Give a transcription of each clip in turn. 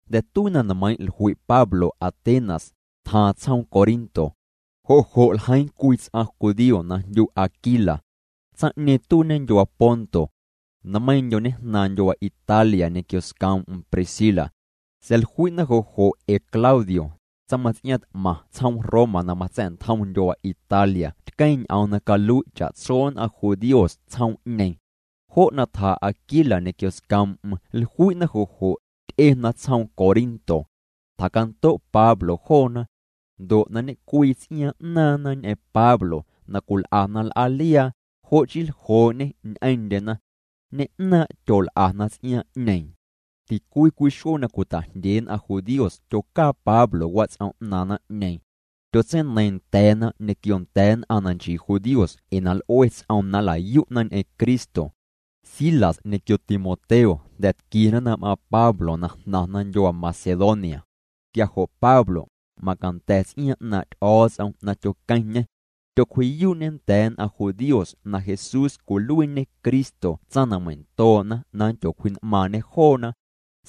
Jnda̱ tuii na nmeiiⁿ' jlui' Pablo Atenas, tjaaⁿ tsjoom Corinto. Jo' jo' ljeiiⁿ cwii ts'aⁿ judío na jndyu Aquila. Tsaⁿ'ñeeⁿ tuiiñê ndyuaa Ponto. Nmeiiⁿndyo ñejnaaⁿ ndyuaa Italia ñequio scoom'm Priscila. Sa̱a̱ jlui'na jo' jo' ee Claudio, tsaⁿmaⁿts'iaaⁿ t'maⁿ tsjoom Roma na matsa̱'ntjom ndyuaa Italia tqueⁿ ñ'oom na calui' cha'tso nn'aⁿ judíos tsjoom'ñeeⁿ. Jo' na tja Aquila ñequio scoom'm jlui'na jo' jo', ty'ena tsjoom Corinto. Tjacando' Pablo joona. Ndo' na ñe'cwii ts'iaaⁿ 'naaⁿna ñ'eⁿ Pablo na cwil'ana l'aaliaa, jo' chii ljoo'ñê ñ'eⁿndyena. Ñe'naaⁿ' tyol'ana ts'iaaⁿ'ñeeⁿ. Ticwii cwii xuee na cwita'jndyee nn'aⁿ judíos tyocaa Pablo wats'om 'naaⁿ naⁿ'ñeeⁿ. Tyotseineiiⁿ nda̱a̱na ñequio nda̱a̱ nn'aⁿ na nchii judíos ee na l'ue ts'oom na nla'yu'na ñ'eⁿ Cristo. Silas ñequio Timoteo jnda̱ tquiena na m'aaⁿ Pablo na jnaⁿna ndyuaa Macedonia. Quia jo' Pablo, macanda̱ ts'iaaⁿ 'naaⁿ' Ty'o̱o̱ts'om na tyoqueⁿñê. Tyocwji'yuu'ñê nda̱a̱ nn'aⁿ judíos na Jesús cwiluiiñê Cristo tsaⁿ na meindoo'na na nndyocwji'n'maaⁿñe joona.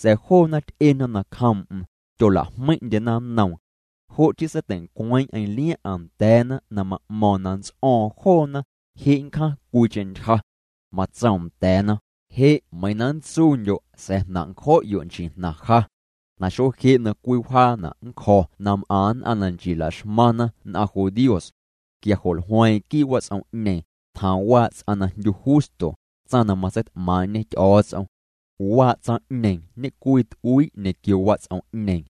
Sa̱a̱ joona ty'ena nacjoom'm, tyola'jmeiⁿ'ndyena nnoom. Jo' chii seitei'ncweeⁿ'eⁿ liaⁿ'aⁿ nda̱a̱na na ma'mo̱o̱ⁿ na nts'o̱o̱ⁿ joona, je' nncjaⁿ cwiicheⁿ ntyja. Matsoom nda̱a̱na: —Je' meiiⁿ na nntsuundyo' sa̱a̱ jnaⁿ' ncjo'yo' nchii jnaⁿ ja. Na je' xuee na cwii wjaana' nncjo̱ na m'aⁿ nn'aⁿ na nchii laxmaⁿna nn'aⁿ judíos. Quia jo' jlueeⁿ'eⁿ quii' wats'om'ñeeⁿ, tjaaⁿ waa' ts'aⁿ na jndyu Justo, tsaⁿ na matseit'maaⁿ'ñe Ty'o̱o̱ts'om. Waa' tsaⁿ'ñeeⁿ ñe'cwii t'uii' ñequio wats'om'ñeeⁿ.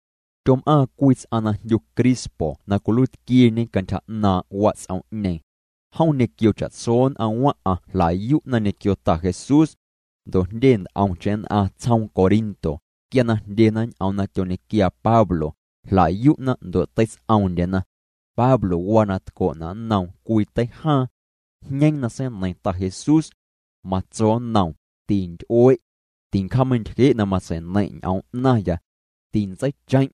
Tyom'aaⁿ cwii ts'aⁿ na jndyu Crispo na cwiluiitquieñe cantyja 'naaⁿ' wats'om'ñeeⁿ. Jom ñequio cha'tso nn'aⁿ waⁿ'aⁿ jla'yu'na ñequio Ta Jesús. Ndo' jndye nt'omcheⁿ nn'aⁿ tsjoom Corinto, quia na jndyena ñ'oom na tyoñequiaa Pablo, jla'yu'na ndo' teits'oomndyena. Pablo waa na tco'na' nnoom cwii teijaaⁿ. Jñeeⁿ na seineiⁿ Ta Jesús. Matso nnoom: —Tinty'ue'. Tincjaameintyje' na matsei'neiⁿ' ñ'oom 'naⁿya. Tintseicheⁿ'.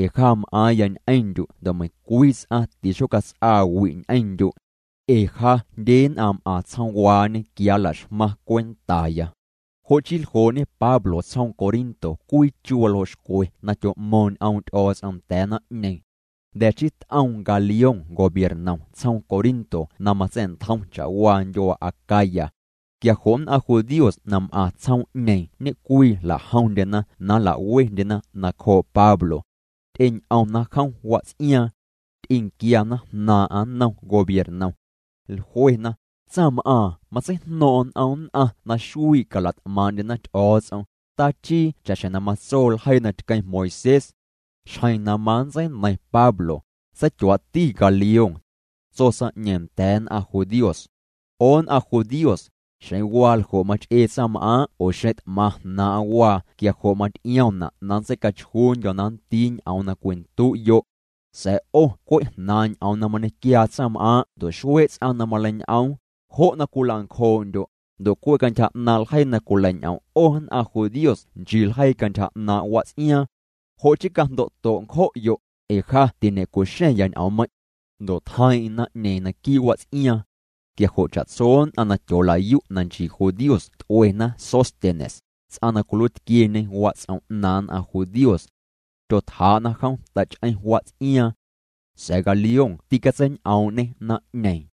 Ee ja m'aaⁿya ñ'eⁿndyu' ndo' meiⁿcwii ts'aⁿ tixocats'aa wi' ñ'eⁿndyu'. Ee ja jndye nn'aⁿ m'aⁿ tsjoomwaañe quia nla'xmaⁿ cwentaya. Jo' chii ljoo'ñe Pablo tsjoom Corinto cwii chu waljoo' xcwe na tyo'mo̱o̱ⁿ ñ'oom' Ty'o̱o̱ts'om nda̱a̱ naⁿ'ñeeⁿ. Jnda̱ chii t'oom Galión gobiernom tsjoom Corinto na matsa̱'ntjoom cha'waa ndyuaa Acaya. Quia jo' nn'aⁿ judíos na m'aⁿ tsjoom'ñeeⁿ ñe'cwii jla'jomndyena na jla'wendyena nacjoo' Pablo. Ty'eñ'omna jom wats'iaaⁿ. Ty'enquiana jnaaⁿ'aⁿ nnom gobiernom. Jluena: —Tsaⁿm'aaⁿ matseijno̱o̱ⁿ'o̱ⁿ n'om nn'aⁿ na xuii' calat'maaⁿ'ndyena Ty'o̱o̱ts'om, tachii cha'xjeⁿ na matso ljeii na tqueⁿ Moisés. Xjeⁿ na manntseineiⁿ Pablo, seityuaa'ti Galión. Tso tsaⁿ'ñeeⁿ nda̱a̱ nn'aⁿ judíos: —'O nn'aⁿ judíos, xeⁿ waa ljo' mach'ee tsaⁿm'aaⁿ' oo xeⁿ t'maⁿ jnaaⁿ'aⁿ waa quia jo' maty'iomna' na nntseicachjuundyo̱ na nndii ñ'oom na cwindu'yo'. Sa̱a̱ 'o cwe' jnaaⁿ' ñ'oom na mañequiaa tsaⁿm'aaⁿ' ndo' xuee' ts'aⁿ na maleiñ'oom, jo' cwilancjoo'ndyo', ndo' cwe' cantyja 'naaⁿ' ljeii na cwileiñ'om' 'o nn'aⁿ judíos nchii ljeii cantyja 'naaⁿ' wats'iaaⁿ. Jo' chii cajndo'to' ncjo'yo', ee ja tiñe'cu'xa̱ⁿya ñ'oommeiⁿ'. Ndo' tjeiiⁿ'eⁿ naⁿ'ñeeⁿ naquii' wats'iaaⁿ. Quia jo' cha'tso nn'aⁿ na tyoolayu' na nchii judíos t'uena Sóstenes, ts'aⁿ na cwiluiitquieñe wats'om 'naaⁿ nn'aⁿ judíos. Tyotjaa'na jom tach'eⁿ wats'iaaⁿ. Sa̱a̱ Galión tîcatseiñ'oom'ñê naⁿ'ñeeⁿ.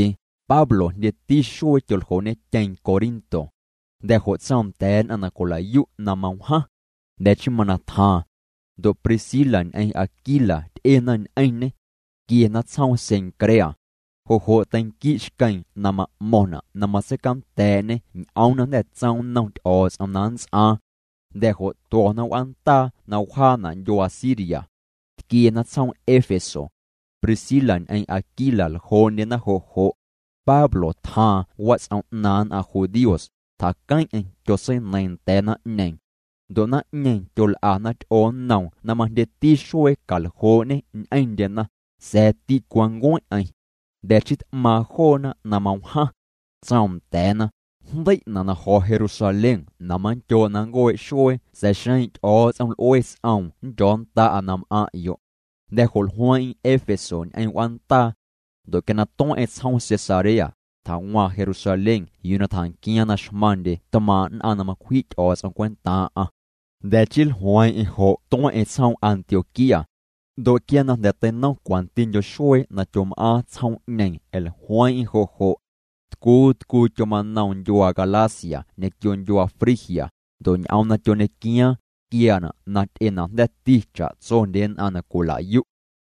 Pablo, jndyeti xuee tyoljoo'ñetyeeⁿ Corinto. Jnda̱ jo' tsoom nda̱a̱ nn'aⁿ na cwila'yu' na mawjaⁿ. Jnda̱ chii mana tjaaⁿ. Ndo' Priscila ñ'eⁿ Aquila ty'ena ñ'eⁿñê. Tquiena tsjoom Cencrea. Jo' jo' teinqui' xqueeⁿ na ma'mo̱ⁿna' na matseicanda̱a̱'ñê ñ'oom na jnda̱ tsoom nnom Ty'o̱o̱ts'om na nnts'aaⁿ. Jnda̱ jo' tuo̱na w'aandaa na wjaana' ndyuaa Siria. Tquiena tsjoom Éfeso. Priscila ñ'eⁿ Aquila ljoo'ndyena jo' jo'. Pablo tjaaⁿ wats'om 'naaⁿ nn'aⁿ judíos, tjaqueⁿ'eⁿ tyotseineiiⁿ nda̱a̱ naⁿ'ñeeⁿ. Ndo' naⁿ'ñeeⁿ tyol'ana ty'oo nnoom na majndyeti xuee caljoo'ñê ñ'eⁿndyena, sa̱a̱ ticwancueⁿ'eⁿ. Jnda̱ chii t'maaⁿ joona na mawjaⁿ. Tsoom nda̱a̱na: —Jndei'na' na jo̱ Jerusalén na manndyoo' na nncuee' xuee sa̱a̱ xeⁿ Ty'o̱o̱ts'om l'ue ts'oom nndyo̱nnda'a na m'aⁿ'yo'. Jnda̱ jo' jlueeⁿ'eⁿ Éfeso ñ'eⁿ w'aandaa. Ndo' quia na jnda̱ tueⁿ'eⁿ tsjoom Cesarea, tjawaaⁿ Jerusalén yuu na tjanquiaaⁿ na xmaⁿndye tmaaⁿ' nn'aⁿ na macwji' Ty'o̱o̱ts'om cwentaaⁿ'aⁿ. Jnda̱ chii jlueeⁿ'eⁿ jo' tueⁿ'eⁿ tsjoom Antioquía. Ndo' quia na jnda̱ teinom cwantindyo xuee na tyom'aaⁿ tsjoom'ñeeⁿ jlueeⁿ'eⁿ jo' jo'. Tcuu tcuu tyomanoom ndyuaa Galacia ñequio ndyuaa Frigia, ndo' ñ'oom na tyoñequiaaⁿ, tquiaana' na ty'enajnda̱ti cha'tsondye nn'aⁿ na cwila'yu'.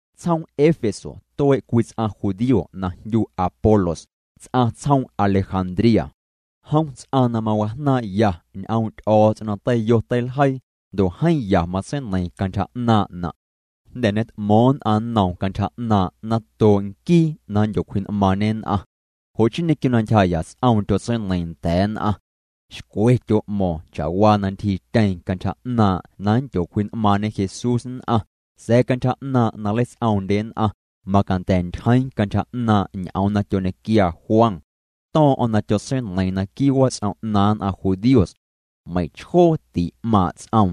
Tsjoom Éfeso tuee' cwii ts'aⁿ judío na jndyu Apolos, ts'aⁿ tsjoom Alejandría. Jom ts'aⁿ na mawajnaaⁿ'ya ñ'oom' Ty'o̱o̱ts'om na teiyo teiljeii, ndo' jeeⁿ ya matseineiiⁿ cantyja 'naaⁿ'na'. Jnda̱ ñet'mo̱o̱ⁿ nn'aⁿ nnoom cantyja 'naaⁿ' natoo' nquii na nndyocwji'n'maaⁿñe nn'aⁿ. Jo' chii ñequio na ntyjaa' ts'oom tyotseineiiⁿ nda̱a̱ nn'aⁿ. Xcwe tyo'mo̱o̱ⁿ cha'waa na ntyjiityeeⁿ cantyja 'naaⁿ' na nndyocwji'n'maaⁿñe Jesús nn'aⁿ, sa̱a̱ cantyja 'naaⁿ' na nleits'oomndye nn'aⁿ, macanda̱ ntyjeeⁿ cantyja 'naaⁿ' ñ'oom na tyoñequia Juan. To̱o̱ⁿ'o̱ⁿ na tyotseineiiⁿ naquii' wats'om 'naaⁿ nn'aⁿ judíos. Meiⁿchjoo tî'maaⁿ' ts'oom.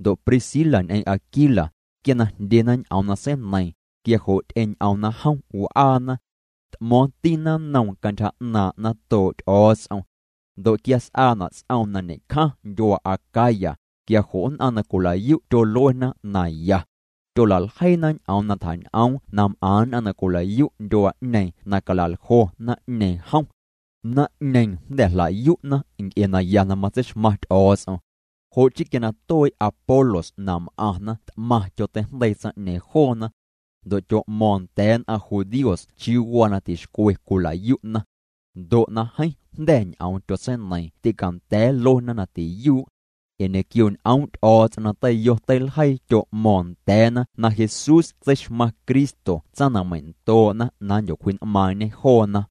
Ndo' Priscila ñ'eⁿ Aquila, quia na jndyena ñ'oom na seineiiⁿ, quia jo' ty'eñ'omna jom w'aana. T'mo̱o̱ⁿtina nnoom cantyja 'naaⁿ' natoo' Ty'o̱o̱ts'om. Ndo' quia s'aana' ts'oom na ñe'cjaⁿ ndyuaa Acaya, quia jo' nn'aⁿ na cwila'yu' tyoluena na ya. Tyola'ljeiina ñ'oom na tjañ'oom na m'aⁿ nn'aⁿ na cwila'yu' ndyuaa'ñeeⁿ na cala'ljo naⁿ'ñeeⁿ jom. Naⁿ'ñeeⁿ jnda̱ jla'yu'na nc'e naya na matseixmaⁿ Ty'o̱o̱ts'om. Jo' chii quia na tuee' Apolos na m'aⁿna t'maⁿ tyoteijndeii tsaⁿ'ñeeⁿ joona. Ndo' tyo'mo̱o̱ⁿ nda̱a̱ nn'aⁿ judíos chiuu waa na tixcwe cwila'yu'na. Ndo' na jeeⁿ jnda̱ ñ'oom tyotseineiiⁿ tîcanda̱a̱ nluena na tiyuu'. Ee ñequio ñ'oom' Ty'o̱o̱ts'om na teiyo teiljeii tyo'mo̱o̱ⁿ nda̱a̱na na Jesús tseixmaⁿ Cristo tsaⁿ na meindoo'na na nndyocwji'n'maaⁿñe joona.